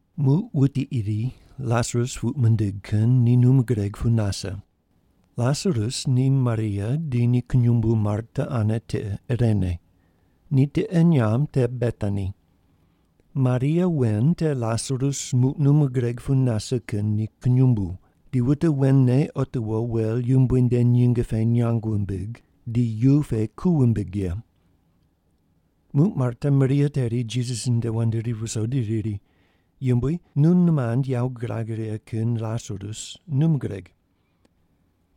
Muq wuti iri Lasarus puq mindig kin ni num gureg pu nase. Lasarus ni Maria di ni kunyumbu Marta ane tiqe irene. Ni tiqe nyamb te Betani. Maria wen te Lasarus muq num gureg pu nase kin ni kunyumbu, di wute wen ne otiwo wel Yumbui nde nyinge pe nyang wumbig, di yu pe ku wumbig ye. Muq Marta Maria teri Jisas nde wand ri viso di riri, “Yumbui, nu nimand yawo gurag righe kin Lasarus num gureg.”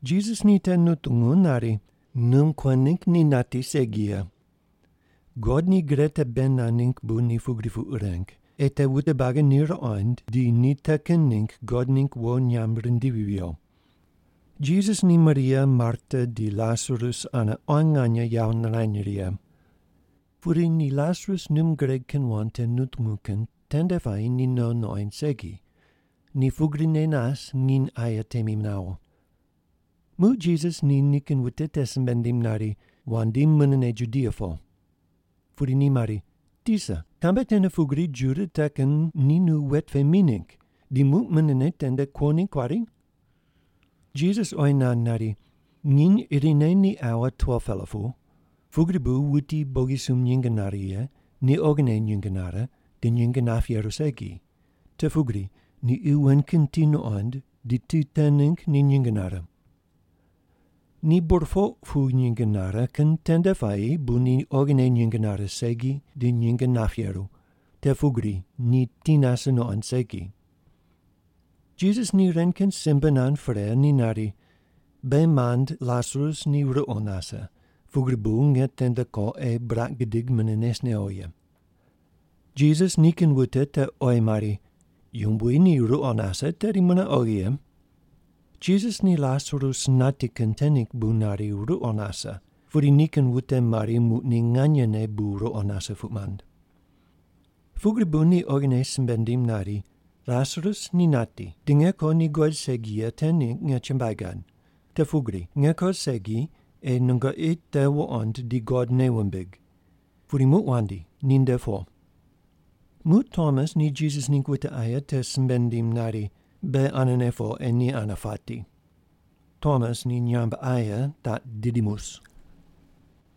Jisas ni te nutungu nari, “Num kuen ningg ni nati segi ye. God ni gre te bei nand ningg bu ni pugri puq reng, ei te wute buagi te ruqond di ni te kin ningg God ningg wo nyamb rindivi viyo.” Jisas ni Maria, Marta di Lasarus ane quan nganye yawo nirany righe. Pudi ni Lasarus num gureg kin wand te nutungu kin tende puayi ni no nuqoind segi, ni pugrine nas nginy aye temi nawo. Muq Jisas ni nikin wute te simbe nindim nari, “Wandi munene Judia po.” Pudi ni oyi mari, “Tisa, kambe tene pugri Juda te kin ni nu wet pe mi ningg, di muq munene tende kuo ningg kuari?” Jisas oyi nand nari, “Nginy irine ni aua 12-pela pu. Pugri bu wuti bogisumb nyinge nare ye ni oghine nyinge nare di nyinge nap yeru segi, te pugri ni qi wen kin ti nuqond, di ti te ningg ni nyinge nare. Ni burpoq pu nyinge nare kin tende puayi bu ni oghine nyinge nare segi di nyinge nap yeru, te pugri ni ti nase nuqond segi.” Jisas ni ren kin simbe nand pre ni nari, “Beghi mand Lasarus ni ruqo nase, pugri bu nge tende ko ei buraq gidig mune nes newo ye.” Jisas nikin wute te oyi mari, “Yumbui, ni ruqo nase, tedi mune oghi ye.” Jisas ni Lasarus nati kin te ningg bu nari ruqo nase, pudi nikin wute mari muq ni nganyene bu ruqo nase puq mand. Pugri bu ni oghine simbe nindim nari, “Lasarus ni nati, di nge ko ni guqoid segi ye te ningg nge chumbuai gad, te pugri nge ko segi ei nungoqi te wuqond di God nei wumbig. Pudi muq wandi ni nde po.” Muq Tomas ni Jisas ningg wute aye te simbe nindim nari, “Beghi anene po ei ni ane pati.” (Tomas ni nyamb aye taq Didimus.)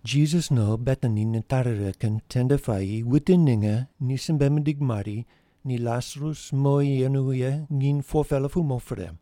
Jisas no Betani nitari righe kin tende puayi wute ninge ni simbe mindig mari ni Lasarus mowi yenu ye nginy 4-pela pu mo pre.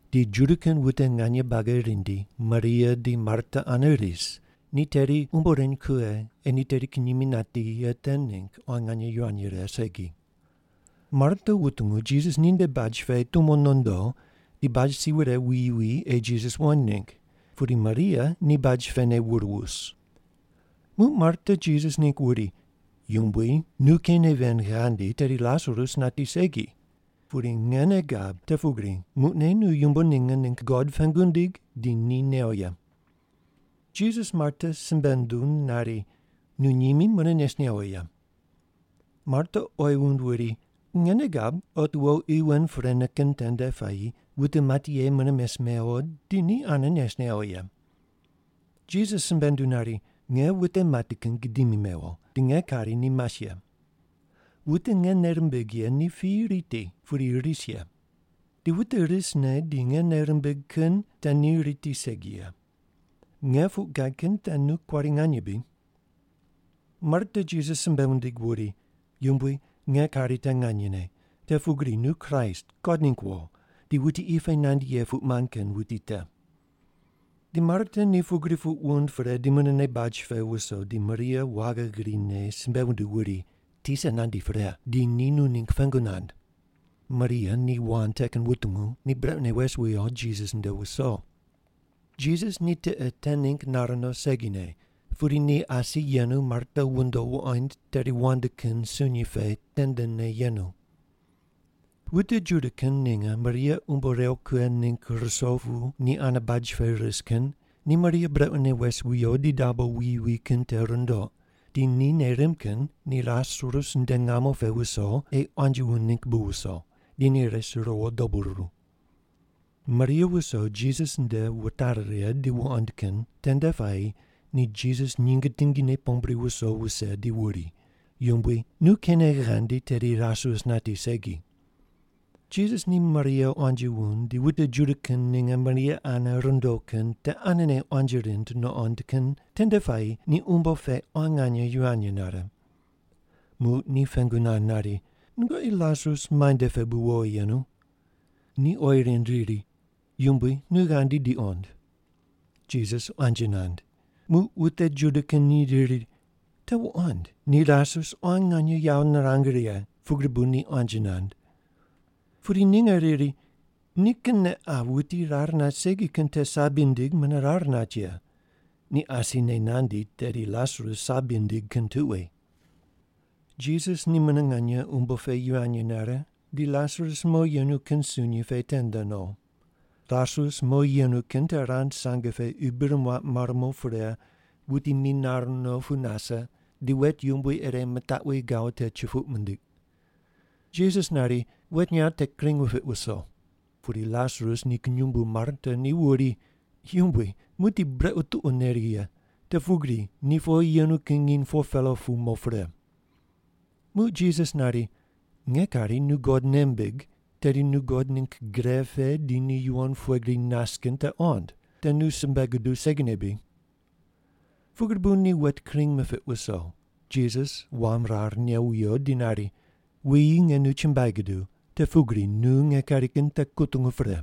di Juda kin wute nganye buagi rindi Maria di Marta ane ris, ni teri umbo reny kughe ei ni teri kinyimi nati ye te ningg quan nganye yivany rire segi. Marta wutungu Jisas ninde baj pe tumo nondo di baj si wure wuyi wi ei Jisas wuqoind ningg, pudi Maria ni baj pene wur wus. Muq Marta Jisas ningg wuri, “Yumbui, nu keine ven ghandi, tedi Lasarus nati segi. Pudi nge nei gab te pugri muqne nu yumbo ninge ningg God pengu ndig di ni new ye.” Jisas Marta simbe nunduw nari, “Nu nyimi mune nes newo ye.” Marta oyi wund wuri, “Nge nei gab otiwo qi wen prene kin tende puayi wute mati ye mune mes mewo di ni ane nes newo ye.” Jisas simbe nunduw nari, “Nge wute mati kin gidimi mewo di nge kari ni mas ye. Wute nge nei rimbigh ye ni piyi riti, pudi ris ye. Di wute risne di nge nei rimbigh kin te ni riti segi ye. Nge puq gad kin te nu kuari nganye bri?” Marta Jisas simbe wundig wuri, “Yumbui, nge kari te nganyene, te pugri nu Kraist, God ningg wo, di wuti qi pe nandi ye puq mand kin wuti te.” Di Marta ni pugri puq wund pre ni munene baj pe wuso di Maria waghi grine simbe wunduw wuri, “Tisa nandi pre, di ni nu ningg pengu nand.” Maria ni wand te kin wutungu ni brequne wes wiyo Jisas nde wuso. Jisas ni tiqe te ningg nar no segine, pudi ni asi yenu Marta wundo wuqoind teri wand kin sunyi pe tendene yenu. Wute Juda kin ninge Maria umbo rew kughe ningg ruso pu ni ane baj pe ris kin ni Maria brequne wes wiyo di dabo wuyi wi kin te rundoq, di ni nei rimb kin ni Lasarus nde ngamo pe wuso ei quanji wund ningg bu wuso, di ni res riwo dobu ruru. Maria wuso Jisas nde wutari righe di wuqoind kin tende puayi ni Jisas nyinge tingine pombri wuso wuse di wuri, “Yumbui, nu keine ghandi tedi Lasarus nati segi.” Jisas ni Maria quanji wund di wute Juda kin ninge Maria ane rundo kin te anene quanji rind nuqond kin tende puayi ni umbo pe quan nganye yivany nare. Muq ni pengu nand nari, “Nungoqi Lasarus muainde pe bu wowi yenu?” Ni oyi rind riri, “Yumbui, nu ghandi di qond.” Jisas quanji nand. Muq wute Juda kin ni riri, “Te wuqond, ni Lasarus quan nganye yawo nirang righe, pugri bu ni quanji nand.” Pudi ninge riri, “Nikinne qa wuti rar nat segi kin te sabi nindig mune rar nat ye. Ni asine nandi tedi Lasarus sabi nindig kin tuqui.” Jisas ni mune nganye umbo pe yivany nare, di Lasarus mowi yenu kin sunyi pe tende no. Lasarus mowi yenu kin te rand sange pe qi bir muaq mar mo pre, wuti minar no pu nase, di wet yumbui ire mitaqwi gawo te chupoq mindiq. Jisas nari, “Wet nyaw te kring wupiq wuso.” Pudi Lasarus ni kunyumbu Marta ni wuri, “Yumbui, muqdi brequ tuqo neri ye, te pugri ni powi yenu kin nginy 4-pela pu mo pre.” Muq Jisas nari, “Nge kari nu God nei mbig, tedi nu God ningg gre pe di ni yuwon pughe gri nas kin te qond, te nu simbe guduw segine bri?” Pugri bu ni wet kring mipiq wuso. Jisas wam rar new wiyo di nari, “Wuyi, nge nu chumbuai guduw, te pugri nu nge kari kin te kutungu pre.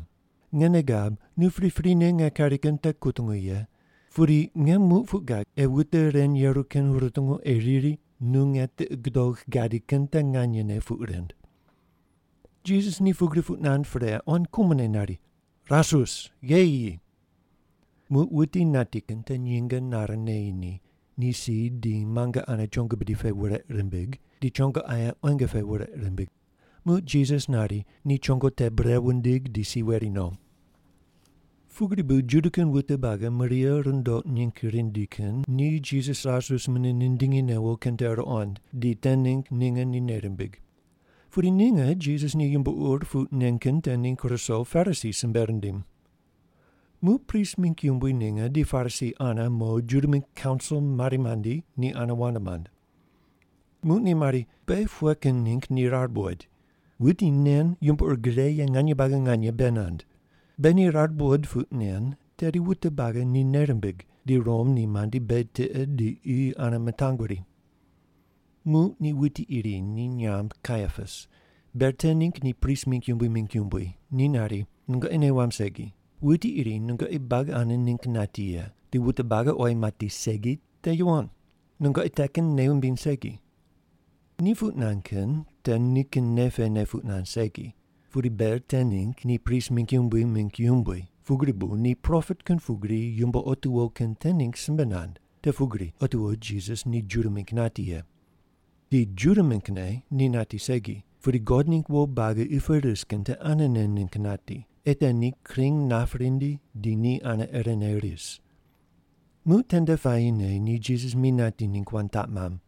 Nge nei gab, nu priprine nge kari kin te kutungu ye, pudi nge muq puq gad ei wute ren yeru kin rutungu ei riri nu nge tiqi gudogh gadi kin te nganyene puq rind.” Jisas ni pugri puq nand pre quan kumone nari, “Lasarus, gheyi yi!” Muq wuti nati kin te nyinge nare neyi ni, ni si di muange ane chongo bidi pe wureq rimbig, di chongo aye quenge pe wureq rimbig. Muq Jisas nari, “Ni chongo te bure wundig, di si weri no.” Pugri bu Juda kin wute buagi Maria rundoq ningg rindi kin ni Jisas Lasarus mune nindingi newo kin te ruqond, di te ningg ninge ni nei rimbig. Pudi ninge Jisas ni yumbo ur puq nen kin te ningg ruso Parisi simbe rindim. Muq prist mingg yumbui ninge di Parisi ane mo Juda mingg kaunsil mari mandi ni ane wand mand. Muq ni mari, “Beghi pughe kin ningg ni rar buqoid? Wuti nen yumbo ur gre ye nganye buagi nganye bei nand. Beghi ni rar buqoid puq nen, tedi wute buagi ni nei rimbig, di Rom ni mandi beghi tiqe di qi ane mitanguri.” Muq ni wuti iri ni nyamb Kaiapas, ber te ningg ni prist mingg yumbui mingg yumbui, ni nari, “Nungoqi nei wamb segi. Wuti irine nungoqi buagi ane ningg nati ye, di wute buagi oyi mati segi te yuwon. Nungoqi te kin nei wumbiny segi.” Ni puq nand kin te nikin nei pene puq nand segi, pudi ber te ningg ni prist mingg yumbui mingg yumbui, pugri bu ni propet kin pugri yumbo otiwo kin te ningg simbe nand, te pugri otiwo Jisas ni Juda mingg nati ye. Di Juda minggne ni nati segi, pudi God ningg wo buagi qi pe ris kin te anene ningg nati, ei te ni kring nap rindi di ni ane irene ris. Muq tende puayine ni Jisas mi nati ningg wand taq mamb.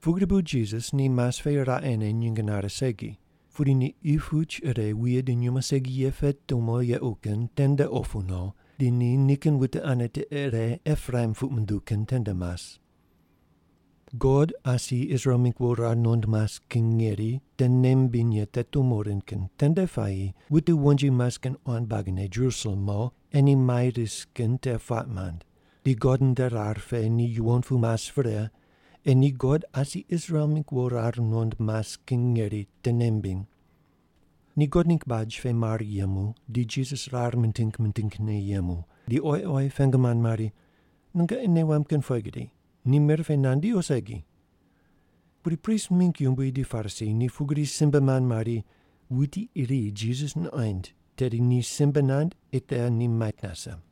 Pugri bu Jisas ni mas pe raqene nyinge nare segi. Pudi ni qi puch ire wuye di nyumo segi ye pe tumo yequ kin tende opu no, di ni nikin wute ane tiqe ire Epraim puq munduw kin tende mas. God asi Israel mingg wo rar nuqond mas kin ngeri te nei mimbiny ye te tumo rind kin tende puayi wute wonji mas kin quan buagine Jerusalem mo, ei ni mai rise kin te puaq mand, di God nde rar pe ni yuwon pu mas pre, ei ni God asi Israel mingg wo rar nuqond mas kin ngeri te nei mimbiny. Ni God ningg baj pe mar yemu di Jisas rar miting mitingne yemu, di oyi oyi pengu mand mari, “Nungoqi nei wamb kin pughe gri, ni mir pe nandi o segi?” Pudi prist mingg yumbui di Parisi ni pugri simbe mand mari, wuti iri Jisas nuqoind tedi ni simbe nand ei te ni mait nase.